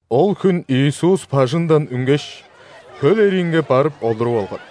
Ол хүн Иисус бажыңдан үнгеш, хөл эриинге барып олуруп алган.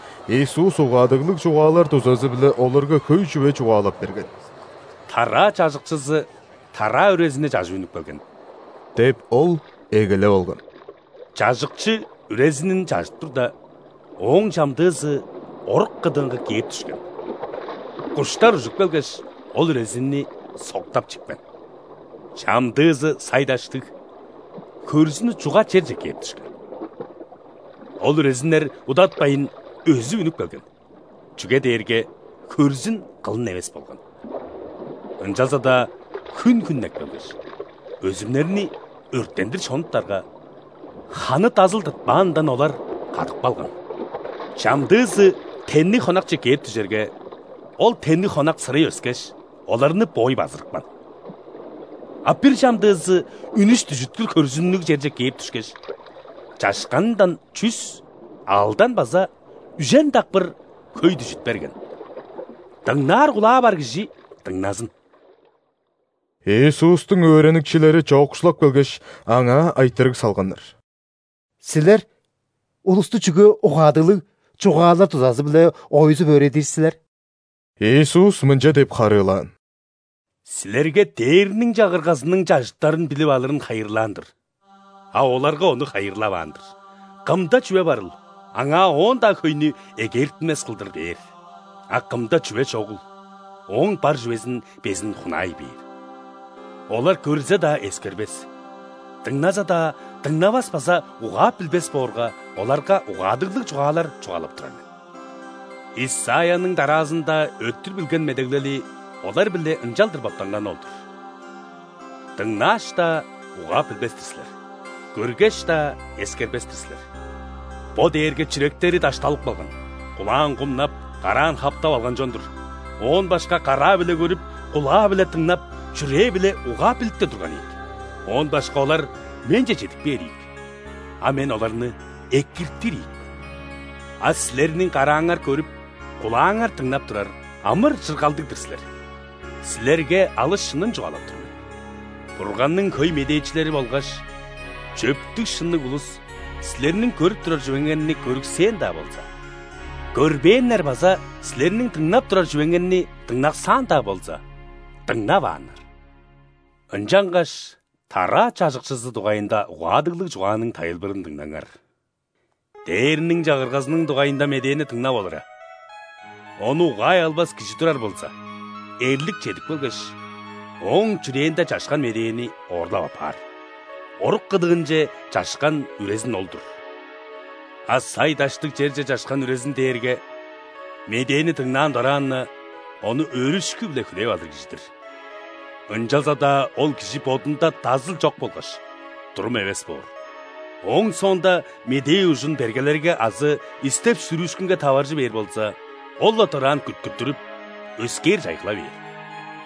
Иисус угаадыглыг чугаалар дузазы-биле оларга хөй чүве чугаалап берген. «Тараа чажыкчызы тараа үрезини чажып үнүп келген – деп, Ол эгелеп алган. – Чажыкчы үрезинин чажып турда, ооң чамдыызы орук кыдыынга кээп дүшкен – куштар ужуп келгеш, ол үрезинни соктап чипкен. Чамдыызы сай-даштыг, хөрзүнү чуга черже кээп дүшкен. Ол үрезиннер удатпайн өзүп үнүп келген, чүге дээрге хөрзүн кылын эвес болган. Ынчалза-даа хүн хүннеп келгеш, өзүмнерни өрттендир шонуптарга, ханы дазыл тыртпаанындан, олар кадып калган. Чамдыызы тенниг хонакче кээп дүжерге, ол тенниг хонак сырый өскеш, оларны боой базырыпкан. А бир чамдыызы үнүш-дүжүткүр хөрзүннүг черже кээп дүшкеш, чашканындан чүс, алдан база үжен дакпыр хөй дүжүт берген. Дыңнаар кулаа бар кижи дыңназын!» Иисустуң өөреникчилери чоокшулап келгеш, Аңаа айтырыг салганнар: «Силер улусту чүге угаадыглыг чугаалар дузазы-биле ойзуп өөредир силер?» Иисус мынча деп харыылаан: «Силерге Дээрниң Чагыргазының чажыттарын билип алырын хайырлаан-дыр, а оларга ону хайырлаваан-дыр. Кымда чүве барыл, аңаа оон-даа хөйнү эгээртинмес кылдыр бээр. А кымда чүве чогул, ооң бар чүвезин безин хунаай бээр. Олар көрзе-даа, эскербес, дыңназа-даа, дыңнавас база угаап билбес боорга, оларга угаадыглыг чугаалар чугаалап турар мен. Исайяның дараазында өттүр билген медеглели олар-биле ынчалдыр боттанганы ол-дур:„Дыңнааш-даа, угаап билбес-тир силер,көргеш-даа, эскербес-тир силер. Бо дээрге чүректери дашталып калган,кулаан кумнап, караан хаптап алган чон-дур –оон башка караа-биле көрүп, кулаа-биле дыңнап,чүрээ-биле угаап билиптер турган ийик;оон башка олар Менче чедип кээр ийик,а Мен оларны экиртир ийик мен“. А силерниң карааңар көрүп, кулааңар дыңнап турар – амыр-чыргалдыг-дыр силер. Силерге алыс шынын чугаалап тур мен: Бурганның хөй медээчилери болгаш чөптүг-шынныг улус силерниң көрүп турар чүвеңерни көрүксээн-даа болза, көрбээннер база силерниң дыңнап турар чүвеңерни дыңнаксаан-даа болза, дыңнавааннар». «Ынчангаш тараа чажыкчызы дугайында угаадыглыг чугааның тайылбырын дыңнаңар. Дээрниң Чагыргазының дугайында медээни дыңнап олура, ону угаай албас кижи турар болза, эрлик чедип келгеш, ооң чүрээнде чашкан медээни оорлап аппаар. Орук кыдыынче чашкан үрезин ол-дур. А сай-даштыг черже чашкан үрезин дээрге медээни дыңнаан дораан-на, ону өөрүшкү-биле хүлээп алыр кижи-дир. Ынчалза-даа ол кижи бодунда дазыл чок болгаш, турум эвес боор. Ооң соонда медээ ужун бергелерге азы истеп-сүрүүшкүнге таваржы бээр болза, ол-ла дораан күткүттүрүп, өскээр чайгыла бээр.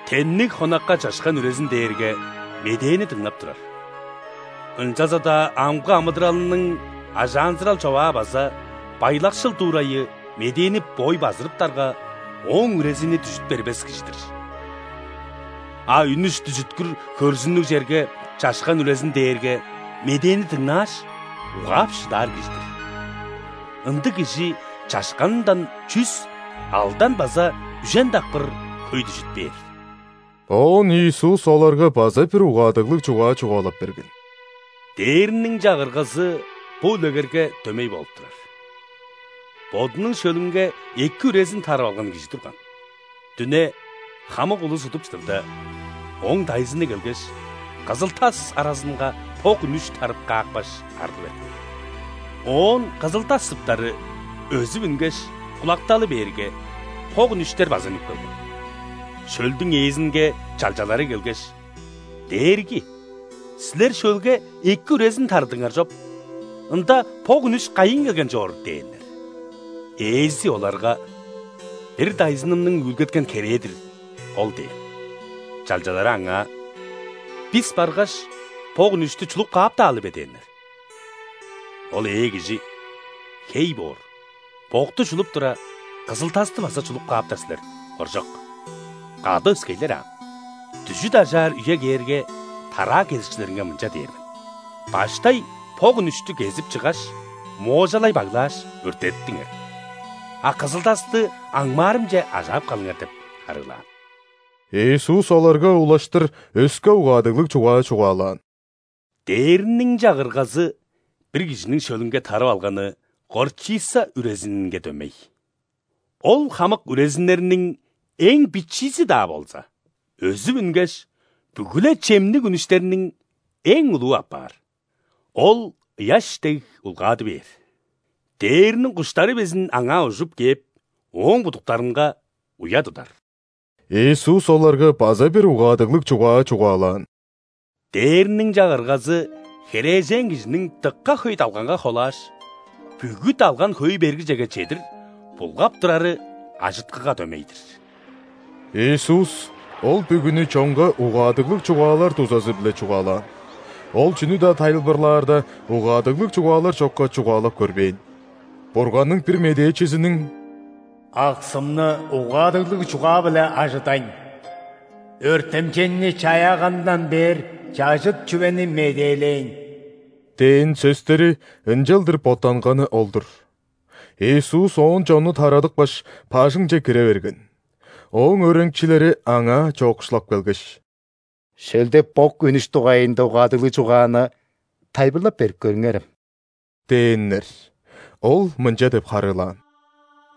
Тенниг хонакка чашкан үрезин дээрге медээни дыңнап турар, ынчалза-даа амгы амыдыралының ажаанзырал-човаа база байлакшыл дуурайы медээни боой базырыптарга, ооң үрезини дүжүт бербес кижи-дир. А үнүш-дүжүткүр хөрзүннүг черге чашкан үрезин дээрге медээни дыңнааш, угаап шыдаар кижи-дир. Ындыг кижи чашканындан чүс, алдан база үжен дакпыр хөй дүжүт бээр». Оон Иисус оларга база бир угаадыглыг чугаа чугаалап берген: «Дээрниң Чагыргазы бо үлегерге дөмей болуп турар. Бодунуң шөлүнге эки үрезин тарып алган кижи турган. Дүне, хамык улус удуп чыдырда, ооң дайзыны келгеш, кызыл-тас аразынга бок үнүш тарып каапкаш, арлы берген. Оон кызыл-тас сыптары өзүп үнгеш, кулакталы бээрге, бок үнүштер база үнүп келген. Шөлдүң ээзинге чалчалары келгеш: „Дээрги! Силер шөлге эки үрезин тарыдыңар чоп. Ында бок үнүш кайыын келген чоор?“ – дээннер. Ээзи оларга: „Бир дайзынымның үүлгеткен херээ-дир ол“ – дээн. Чалчалары аңаа: „Бис баргаш, бок үнүштү чулуп кааптаалы бе?“ – дээннер. Ол ээ кижи: „Хей боор, бокту чулуп тура, кызыл-тасты база чулуп кааптар силер, хоржок. Кады өскейлер аан. Дүжүт ажаар үе кээрге, тараа кезикчилеринге мынча дээр мен: ‘Баштай бок үнүштү кезип, чыггаш, моожалай баглааш, өрттедиптиңер, а кызыл-тасты аңмаарымче ажаап калыңар’“ – деп харыылаан». Иисус оларга улаштыр өске угаадыглыг чугаа чугаалаан: «Дээрниң Чагыргазы бир кижиниң шөлүнге тарып алганы горчица үрезининге дөмей. Ол хамык үрезиннерниң эң бичиизи-даа болза, өзүп үнгеш, бүгү-ле чемниг үнүштерниң эң улуу апаар. Ол ыяш дег улгады бээр, дээрниң куштары безин аңаа ужуп кээп, ооң будуктарынга уя тудар». Иисус оларга база бир угаадыглыг чугаа чугаалаан: «Дээрниң Чагыргазы херээжен кижиниң дыка хөй далганга холааш, бүгү далган хөөй бергижеге чедир булгап турары ажыткыга дөмей-дир». Иисус ол бүгүнү чонга угаадыглыг чугаалар дузазы-биле чугаалаан. Ол чүнү-даа тайылбырлаарда, угаадыглыг чугаалар чокка чугаалап көрбээн. Бурганның бир медээчизиниң: «Аксымны угаадыглыг чугаа-биле ажыдайн, өртемчейни чаяаганындан бээр чажыт чүвени медээлээйн» – дээн сөстери ынчалдыр боттанганы ол-дур. Иисус оон чонну тарадыпкаш, бажыңче кире берген. Ооң өөреникчилери Аңаа чоокшулап келгеш: «Шөлде бок үнүш дугайында угаадыглыг чугааны тайылбырлап берип көрүңерем» – дээннер. Ол мынча деп харыылаан: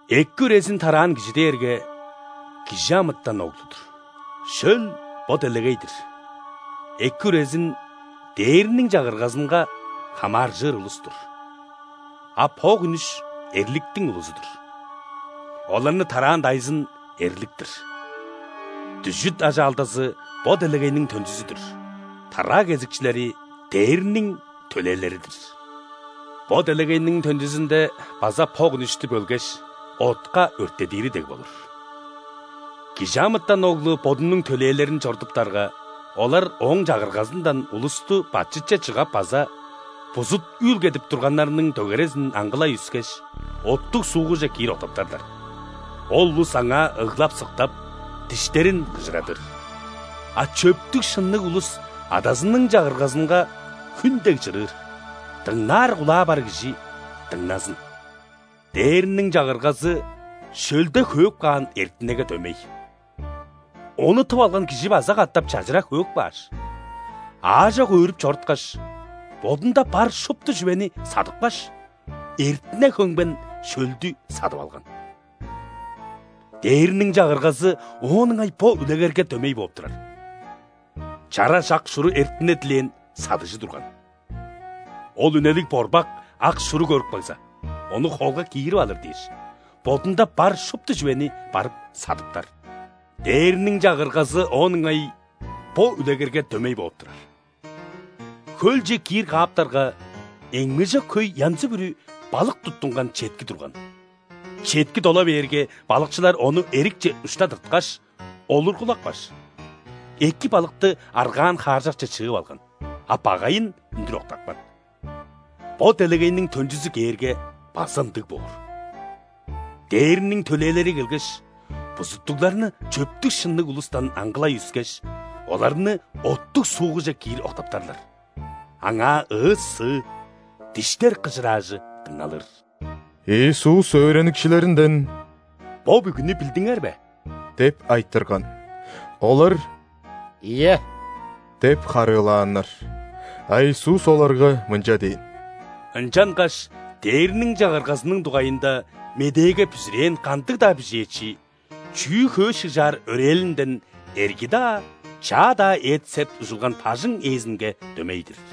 «Эки үрезин тараан кижи дээрге ·Кижи амытан Оглу-дур. Шөл – бо делегей-дир, эки үрезин – Дээрниң Чагыргазынга хамааржыр улус-тур, а бок үнүш – эрликтиң улузу-дур. Оларны тараан дайзын – эрлик-тир. Дүжүт ажаалдазы – бо делегейниң төнчүзү-дүр, тараа кезикчилери – ·дээрниң төлээлери-дир. Бо делегейниң төнчүзүнде база бок үнүштү бөлгеш, отка өрттедири дег болур. ·Кижи амытан Оглу Бодунуң төлээлерин чорудуптарга, олар Ооң Чагыргазындан улусту бачытче чыгап база бузут үүлгедип турганнарның дөгерезин аңгылай үскеш, оттуг суугуже киир октаптарлар. Ол улус аңаа ыглап-сыктап, диштерин кыжырадыр. А чөптүг-шынныг улус Адазының Чагыргазынга хүн дег чырыыр. Дыңнаар кулаа бар кижи дыңназын!» «Дээрниң Чагыргазы шөлде хөөп каан эртинеге дөмей. Ону тып алган кижи база катап чажыра хөөп кааш, аажок өөрүп чоруткаш, бодунда бар шупту чүвени садыпкаш, эртине хөмген шөлдү садып алган. Дээрниң Чагыргазы оон ыңай бо үлегерге дөмей бооп турар. Чараш ак шуру эртине дилээн садыгжы турган. Ол үнелиг борбак ак шуру көрүп кагза, ону холга киирип алыр дээш, бодунда бар шупту чүвени барып садыптар. Дээрниң Чагыргазы оон ыңай бо үлегерге дөмей бооп турар. Хөлче киир кааптарга, эңмежок хөй янзы-бүрү балык туттунган четки турган. Четки дола бээрге, балыкчылар ону эрикче ушта тырткаш, олургулапкаш, эки балыкты аргаан хааржакче чыып алган, а багайын үндүр октапкан. Бо делегейниң төнчүзү кээрге, база ындыг боор. Дээрниң төлээлери келгеш, бузуттугларны чөптүг-шынныг улустан аңгылай үскеш, оларны оттуг суугуже киир октаптарлар. Аңаа ыы-сыы, диштер кыжыраажы дыңналыр». Иисус өөреникчилеринден: «Бо бүгүнү билдиңер бе?» – деп айтырган. Олар: «Ийе» – деп харыылааннар. А Иисус оларга мынча дээн: «Ынчангаш Дээрниң Чагыргазының дугайында медээге бүзүрээн кандыг-даа бижээчи чүү-хөө шыгжаар өрээлинден эрги-даа, чаа-даа эт-сеп ужулган бажың ээзинге дөмей-дир».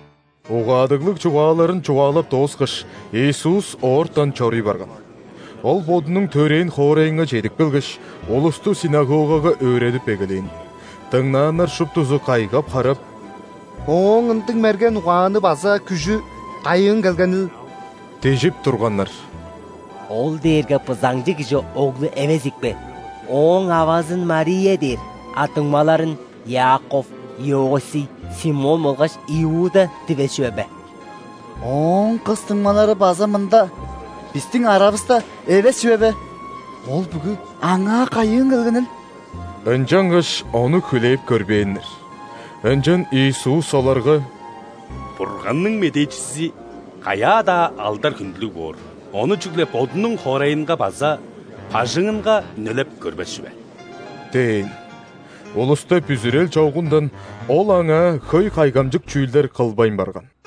Угаадыглыг чугааларын чугаалап дооскаш, Иисус оортан чоруй барган. Ол Бодунуң төрээн хоорайынга чедип келгеш, улусту ·синагогага өөредип эгелээн. Дыңнааннар шуптузу кайгап-харап: «Ооң ындыг мерген угааны база күжү кайыын келгенил? – дижип турганнар. – Ол дээрге бызаңчы кижи оглу эвес ийикпе? Ооң авазын Мария дээр, а дуңмаларын Иаков, Иосий, Симон болгаш Иуда дивес чүве бе? Ооң кыс дуңмалары база мында, бистиң аравыста эвес чүве бе? Ол бүгү Аңаа кайыын келгенил?» Ынчангаш Ону хүлээп көрбээннер. Ынчан Иисус оларга: «Бурганның медээчизи каяа-даа алдар-хүндүлүг боор, ону чүгле бодунуң хоорайынга база бажыңынга үнелеп көрбес чүве» – дээн. Улуста бүзүрел чогундан Ол аңаа хөй кайгамчык чүүлдер кылбайн барган.